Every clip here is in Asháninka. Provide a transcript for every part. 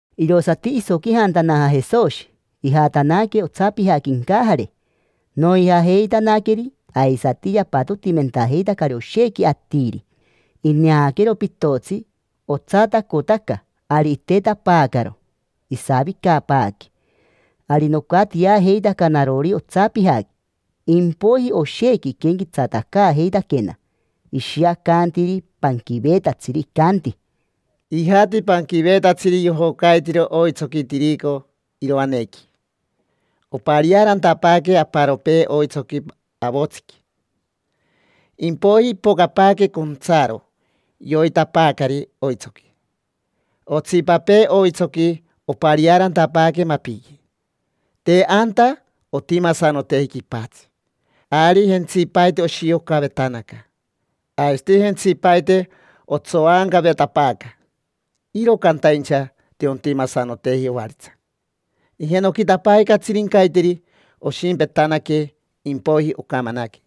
Irosati isoquijantanaja Jesoshi, ijatanaque otsapijaqui incajare. Noijajeitanaqueri, aisati yapatotimentajeitacari oshequi atiri. Ineaquero pitotsi, otsatacotaca; ari itetapaacaro, isavicapaaque. Ari nocatiajeitaca narori otsapijaqui. Impoiji, oshequi iquenquetsatacaajeitaquena, ishiacantiri panquiveetatsiri, icanti: —Ijati panquiveetatsiri yojocaitiro oitsoqui tirico iroanequi. Opariaarantapaaque aparopee oitsoqui avotsiqui, impoiji ipocapaaque contsaro, yoitapaacari oitsoqui. Otsipapee oitsoqui opariaarantapaaque mapiqui. Te anta ontimasanoteji quipatsi, ari jentsipaite oshiocavetanaca, aisati jentsipaite otsoancavetapaaca. Iro cantaincha te ontimasanoteji ovaritsa. Ijenoquitapaaque catsirincaiteri, oshimpetanaque, impoiji ocamanaque.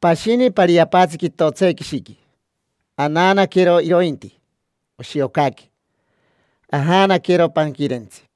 Pashini pariapaintsi quitotsequishiqui: anaanaquero irointi, oshiocaque, ajaanaquero panquirentsi.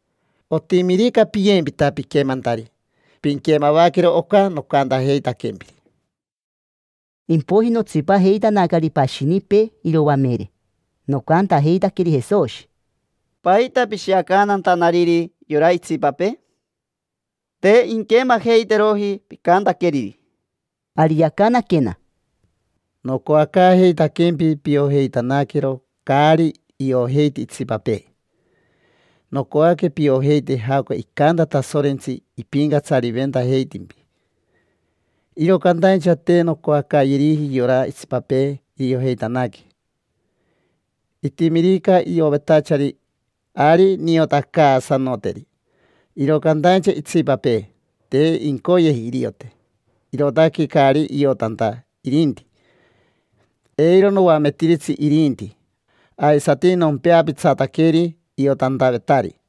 Otimirica piyempita piquemantari, pinquemavaquero oca nocantajeitaquempiri. Impoiji notsipajeitanacari pashinipee iroamere, nocantajeitaqueri Jesoshi: —¿Paita pishiacantantanariri yora itsipapee? Te inquemajeiteroji picantaqueriri. Ari yacanaquena: —Nocoacaajeitaquempi piojeitanaquero caari iojeiti itsipapee. Nocoaque piojeite jaoca icanta Tasorentsi ipincatsariventajeitimpi, iro cantaincha te noncoacayeriji yora itsipapee iriojeitanaque. Itimirica iovetachari, ari niotacaasanoteri. Iro cantaincha itsipapee, te incoyeji iriote, irootaque caari iotanta irinti; eiro noametiritsi irinti, aisati nompeapitsataqueri iotantavetari.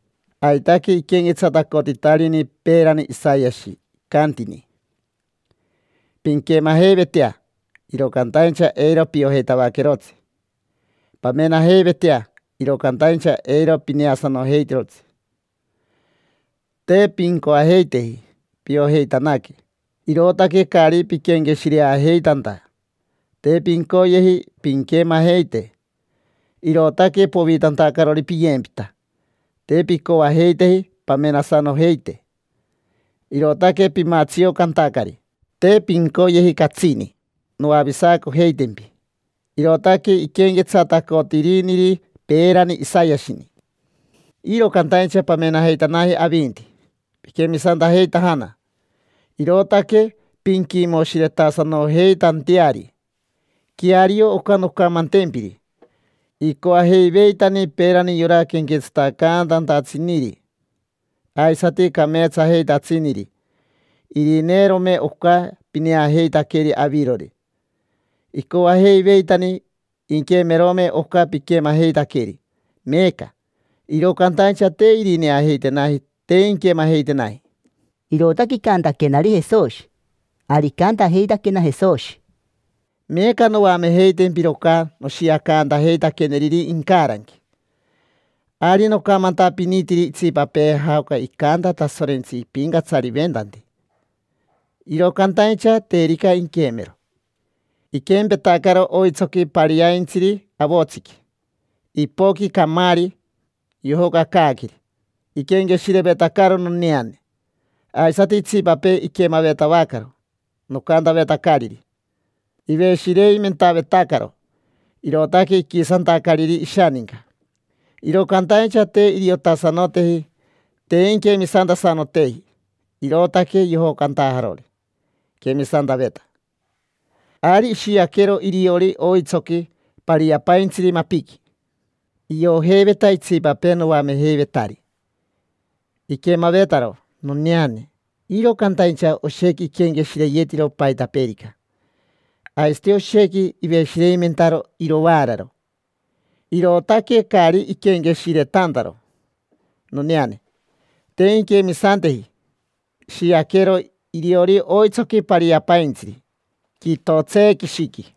Aitaque iquenquetsatacotitarini peerani Isayashi, icantini: “Pinquemajeivetea, iro cantaincha eiro piojeitavaquerotsi. Pamenajeivetea, iro cantaincha eiro pineasanojeitirotsi. Te pincoajeiteji piojeitanaque, irootaque caari piquenqueshireajeitanta. Te pincoyeji pinquemajeite, irootaque povitantacarori piyempita. Te pincoajeiteji pamenasanojeite, irootaque pimatsiocantacari. Te pincoyeji catsini noavisacojeitempi”. Irootaque iquenquetsatacotiriniri peerani Isayashini. Iro cantaincha pamenajeitanaji avinti, piquemisantajeitajana, irootaque pinquimoshiretasanojeitanteari. Queario oca noncamantempiri: icoajeiveitani peerani yora quenquetsatacantantatsiniri aisati cameetsajeitatsiniri irineerome oca pineajeitaqueri avirori. Icoajeiveitani inquemerome oca piquemajeitaqueri meeca. Iro cantaincha te irineajeitenaji, te inquemajeitenaji. Irootaque icantaquenari Jesoshi. Ari icantajeitaquena Jesoshi: —Meeca noamejeitempiro oca noshiacantajeitaqueneriri incaranqui. Ari nocamantapinitiri itsipapee jaoca icanta Tasorentsi ipincatsariventanti, iro cantaincha terica inquemero, iquempetacaro oitsoqui pariaintsiri avotsiqui. Ipoqui camaari, yojocacaaqueri iquenqueshirevetacaro noneane. Aisati itsipapee iquemavetavacaro nocantavetacariri, iveshireimentavetacaro, irootaque iquisantacariri ishaninca. Iro cantaincha te iriotasanoteji, te inquemisantasanoteji, irootaque yojocantajarori iquemisantaveta. Ari ishiaquero iriori oitsoqui pariapaintsiri mapiqui. Iojeiveta itsipapee noamejeivetari, iquemavetaro noneane, iro cantaincha oshequi iquenqueshireyetiro paitapeerica, aisati oshequi iveshireimentaro irovaararo, irootaque caari iquenqueshiretantaro noneane. Te inquemisanteji. Ishiaquero iriori oitsoqui pariapaintsiri quitotseequishiqui.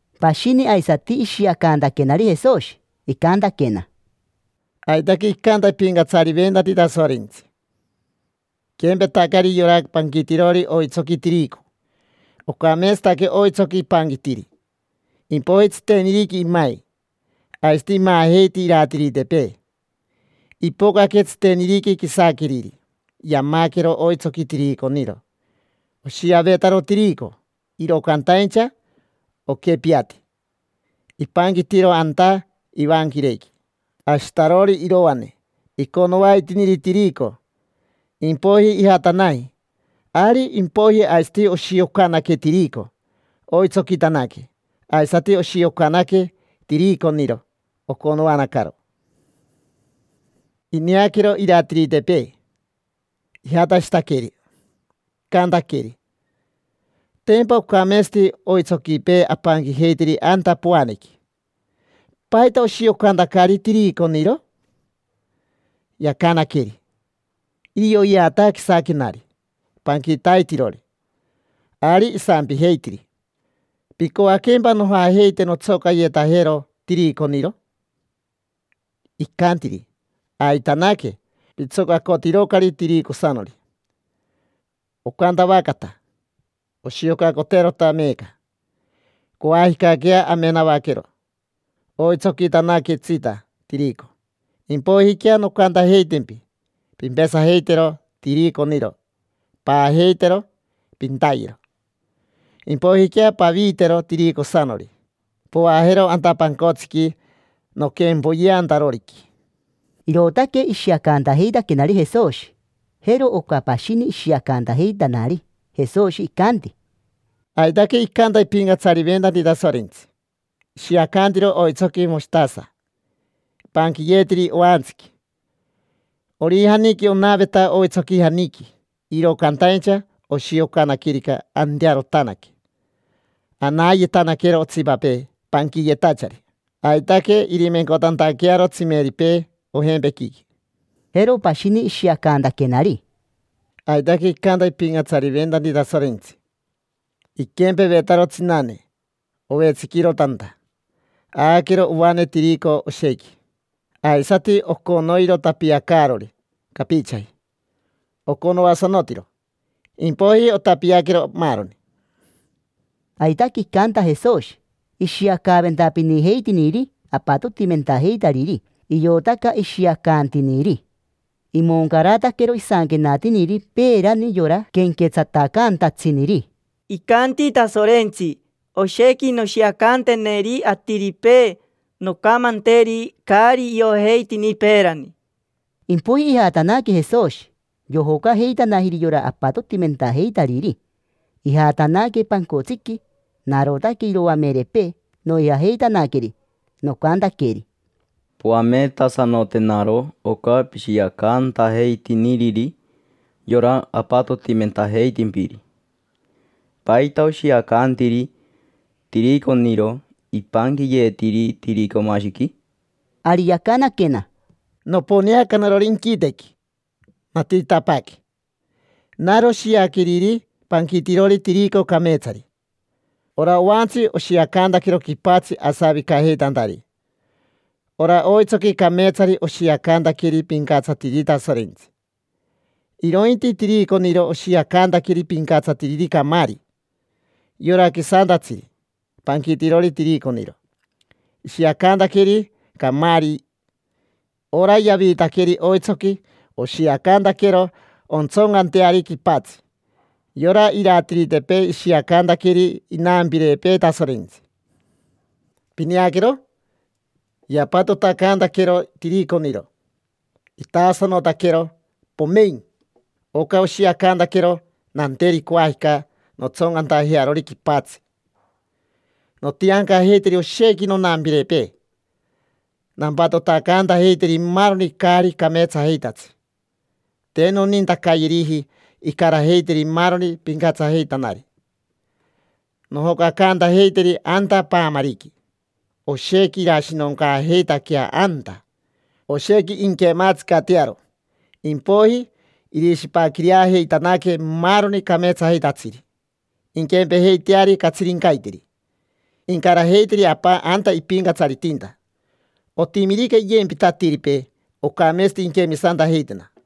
Pashini aisati ishiacantaquenari Jesoshi, icantaquena: —Aitaque icanta ipincatsariventanti Tasorentsi, iquempetacari yora panquitirori oitsoqui tirico. Ocameetsataque oitsoqui ipanquitiri. Impoiji tsiteniriqui imai, aisati imaajeiti iratiritepee. Ipocaque tsiteniriqui quisaqueriri, yamaquero oitsoqui tiriconiro. Oshiavetaro tirico, iro cantaincha oquepiati. Ipanquitiro anta ivanquirequi ashitarori iroane, iconoaitiniri tirico. Impoiji ijatanaji. Ari impoiji aisati oshiocanaque tirico, oitsoquitanaque. Aisati oshiocanaque tiriconiro, oconoanacaro. Ineaquero iratiritepee, ijatashitaqueri, icantaqueri: “Tempa ocameetsati oitsoquipee apanquijeitiri anta poanequi. ¿Paita oshiocantacari tiriconiro?” Yacanaqueri: “Irioyeata quisaquenari panquitaitirori”. Ari isampijeitiri: “¿Picoaquempa nojajeite nontsocayetajero tiriconiro?” Icantiri: “Aitanaque. Pitsocacotirocari tiricosanori. Ocantavacata. Oshiocacoterota meeca. Coajicaquea amenavaquero oitsoquitanaquetsita tirico. Impoijiquea, noncantajeitempi: ‘Pimpesajeitero tiriconiro, paajeitero, pintayero. Impoijiquea paviitero tiricosanori, poajero anta pancotsiqui noquempoyeantaroriqui’”. Irootaque ishiacantajeitaquenari Jesoshi. Jero oca pashini ishiacantajeitanari Jesoshi, icanti: —Aitaque icanta ipincatsariventanti Tasorentsi, ishiacantiro oitsoqui moshitasa ipanquiyeetiri oantsiqui. Orijaniqui onaveta oitsoquijaniqui, iro cantaincha oshiocanaquerica, antearotanaque, anayetanaquero otsipapee panquiyetachari, aitaque irimencotantaquearo tsimeripee ojempequiqui. Jero pashini ishiacantaquenari: —Aitaque icanta ipincatsariventanti Tasorentsi, iquempevetaro tsinane ovetsiquiro tanta. Aaquero ovane tirico oshequi, aisati oconoiro tapiacaarori capichaji. Oconoasanotiro, impoiji otapiaquero maaroni. Aitaque icanta Jesoshi, ishiacaaventapinijeitiniri apatotimentajeitariri, iotaca ishiacantiniri. Imoncarataquero isanquenatiniri peerani yora quenquetsatacantatsiniri: “Icanti Tasorentsi: ‘Oshequi noshiacanteneri atiripee; noncamanteri caari iojeitini peerani’”. Impoiji ijatanaque Jesoshi, yojocajeitanajiri yora apatotimentajeitariri, ijatanaque pancotsiqui. Narotaque iroamerepee, noijajeitanaqueri. Nocantaqueri: —Poametasanotenaro oca pishiacantajeitiniriri yora apatotimentajeitimpiri. ¿Paita oshiacantiri tiriconiro ipanquiyeetiri tiricomashiqui? Ari yacanaquena: —Noponeaca narori inquitequi, natiritapaaque. Naro shiaqueriri panquitirori tirico cameetsari. Ora oantsi oshiacantaquero quipatsi asavicajeitantari. Ora oitsoqui cameetsari oshiacantaqueri pincatsatiriri Tasorentsi. Irointi tiriconiro oshiacantaqueri pincatsatiriri camaari. Yora quisantatsiri, panquitirori tiriconiro, ishiacantaqueri camaari. Ora yaviitaqueri oitsoqui oshiacantaquero ontsoncanteari quipatsi. Yora iratiritepee ishiacantaqueri inampirepee Tasorentsi. Pineaquero, yapatotacantaquero tiriconiro, itaasanotaquero, pomein. Oca oshiacantaquero nanteri coajica nontsoncantajearori quipatsi. Nontiancajeiteri oshequi nonampirepee, nampatotacantajeiteri maaroni caari cameetsajeitatsi; te nonintacayeriji incarajeiteri maaroni pincatsajeitanari. Nojocacantajeiteri anta paamariqui: oshequi irashinoncaajeitaquea anta, oshequi inquematsicatearo. Impoiji irishipaquireajeitanaque maaroni cameetsajeitatsiri, inquempejeiteari catsirincaiteri. Incarajeiteri Apa anta ipincatsaritinta. Otimirica iyempita atiripee, ocameetsati inquemisantajeitena.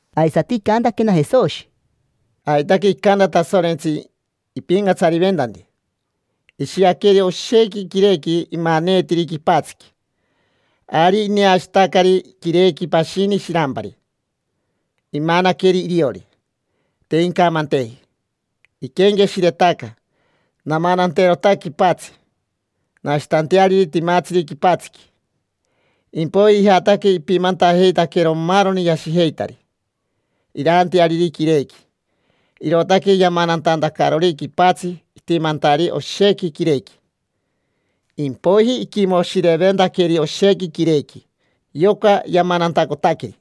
Aisati icantaquena Jesoshi: —Aitaque icanta Tasorentsi ipincatsariventanti, ishiaqueri oshequi quirequi imaneetiri quipatsiqui. Ari ineashitacari quirequi pashini shirampari. Imanaqueri iriori, te incamanteji. Iquenqueshiretaca: “Namananterota quipatsi, nashitanteariri timatsiri quipatsiqui”. Impoiji ijataque ipimantajeitaquero maaroni yashijeitari iraanteariri quirequi. Irootaque yamanantantacarori quipatsi itimantari oshequi quirequi. Impoiji iquimoshireventaqueri oshequi quirequi, yoca yamanantacotaqueri.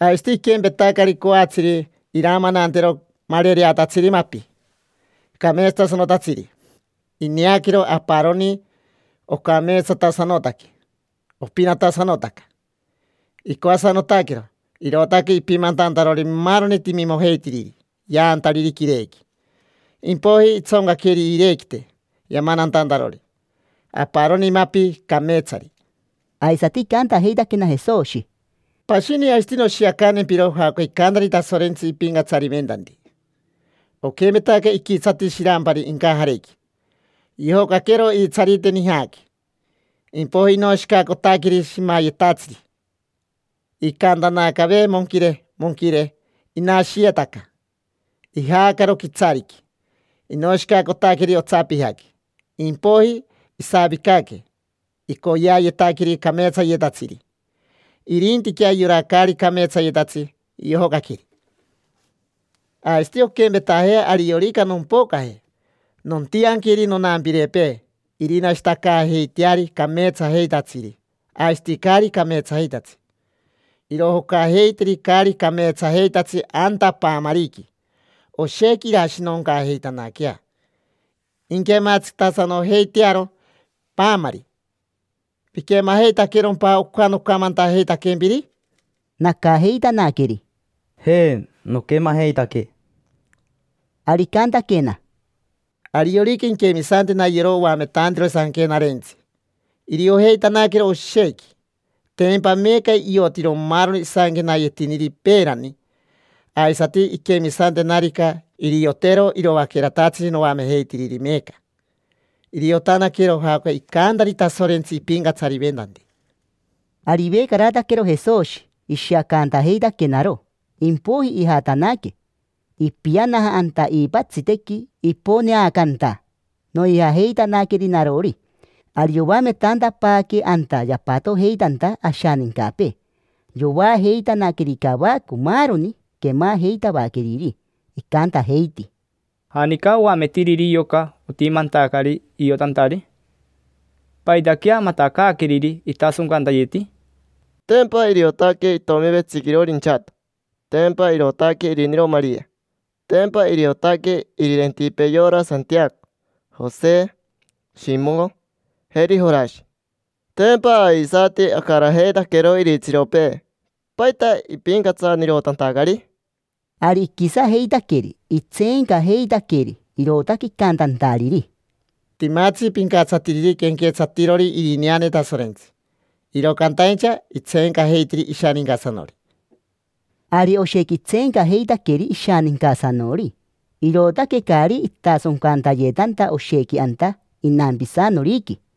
Aisati iquempetacari coatsiri iramanantero marereatatsiri mapi, cameetsatasanotatsiri. Ineaquero aparoni, ocameetsatasanotaque, opinatasanotaca. Icoasanotaquero, irootaque ipimantantarori maaroni timimojeitiriri yaantariri quirequi. Impoiji itsoncaqueri iirequite yamanantantarori aparoni mapi cameetsari. Aisati icantajeitaquena Jesoshi: —Pashini aisati noshiacantempiro jaoca icantari Tasorentsi ipincatsariventanti. Oquempetaca iquitsati shirampari incajarequi. Yojocaquero iitsarite nijaqui, impoiji inoshicacotaqueri shimayetatsiri; icaantanacave, monquire, monquire. Inashiyetaca. Ijaacaro quitsariqui, inoshicacotaqueri otsapijaqui. Impoiji isavicaque, icoyeayetaqueri cameetsayetatsiri. Irintiquea yora caari cameetsayetatsi yojocaqueri. Aisati onquempetajea ariorica nompocaje. Nontianqueri nonampirepee irinashitacaajeiteari cameetsajeitatsiri aisati caari cameetsajeitatsi. Irojocajeiteri caari cameetsajeitatsi anta paamariqui. Oshequi irashinoncaajeitanaquea, inquematsicatasanojeitearo paamari. ¿Piquemajeitaquerompa oca nocamantajeitaquempiri? Nacajeitanaqueri: —Je, noquemajeitaque. Ari icantaquena: —Ariorica inquemisantena yora oametantirori Sanquenarentsi, iriojeitanaquero oshequi: tempa meeca iotiro maaroni isanquenayeetiniri peerani: aisati, inquemisantenarica, iriotero iroaqueratatsiri noamejeitiriri meeca. Iriotanaquero jaoca icantari Tasorentsi ipincatsariventanti. Ari ivecarataquero Jesoshi ishiacantajeitaquenaro, impoiji ijatanaque, ipianaja anta iipatsitequi iponeacanta. Noijajeitanaqueri narori. Ari yoametantapaaque anta yapatojeitanta ashanincapee. Yoajeitanaqueri cavaco maaroni quemajeitavaqueriri, icantajeiti: —¿Janica oametiriri yoca otimantacari iotantari? ¿Paitaquea matacaaqueriri itasoncantayeti? Tempa iriotaque itomi vetsiquirori inchato. Tempa irootaque iriniro Maria. Tempa iriotaque irirentipee yora Santiaco, Jose, Shimo, jeri Jorashi. Tempa aisati acarajeitaquero iritsiropee. ¿Paita ipincatsanirotantacari? Ari iquisajeitaqueri, itseencajeitaqueri, irootaque icantantariri: —Timatsi pincatsatiriri quenquetsatirori irineane Tasorentsi, iro cantaincha itseencajeitiri ishanincasanori. Ari oshequi itseencajeitaqueri ishanincasanori, irootaque caari itasoncantayetanta oshequi anta inampisanoriqui.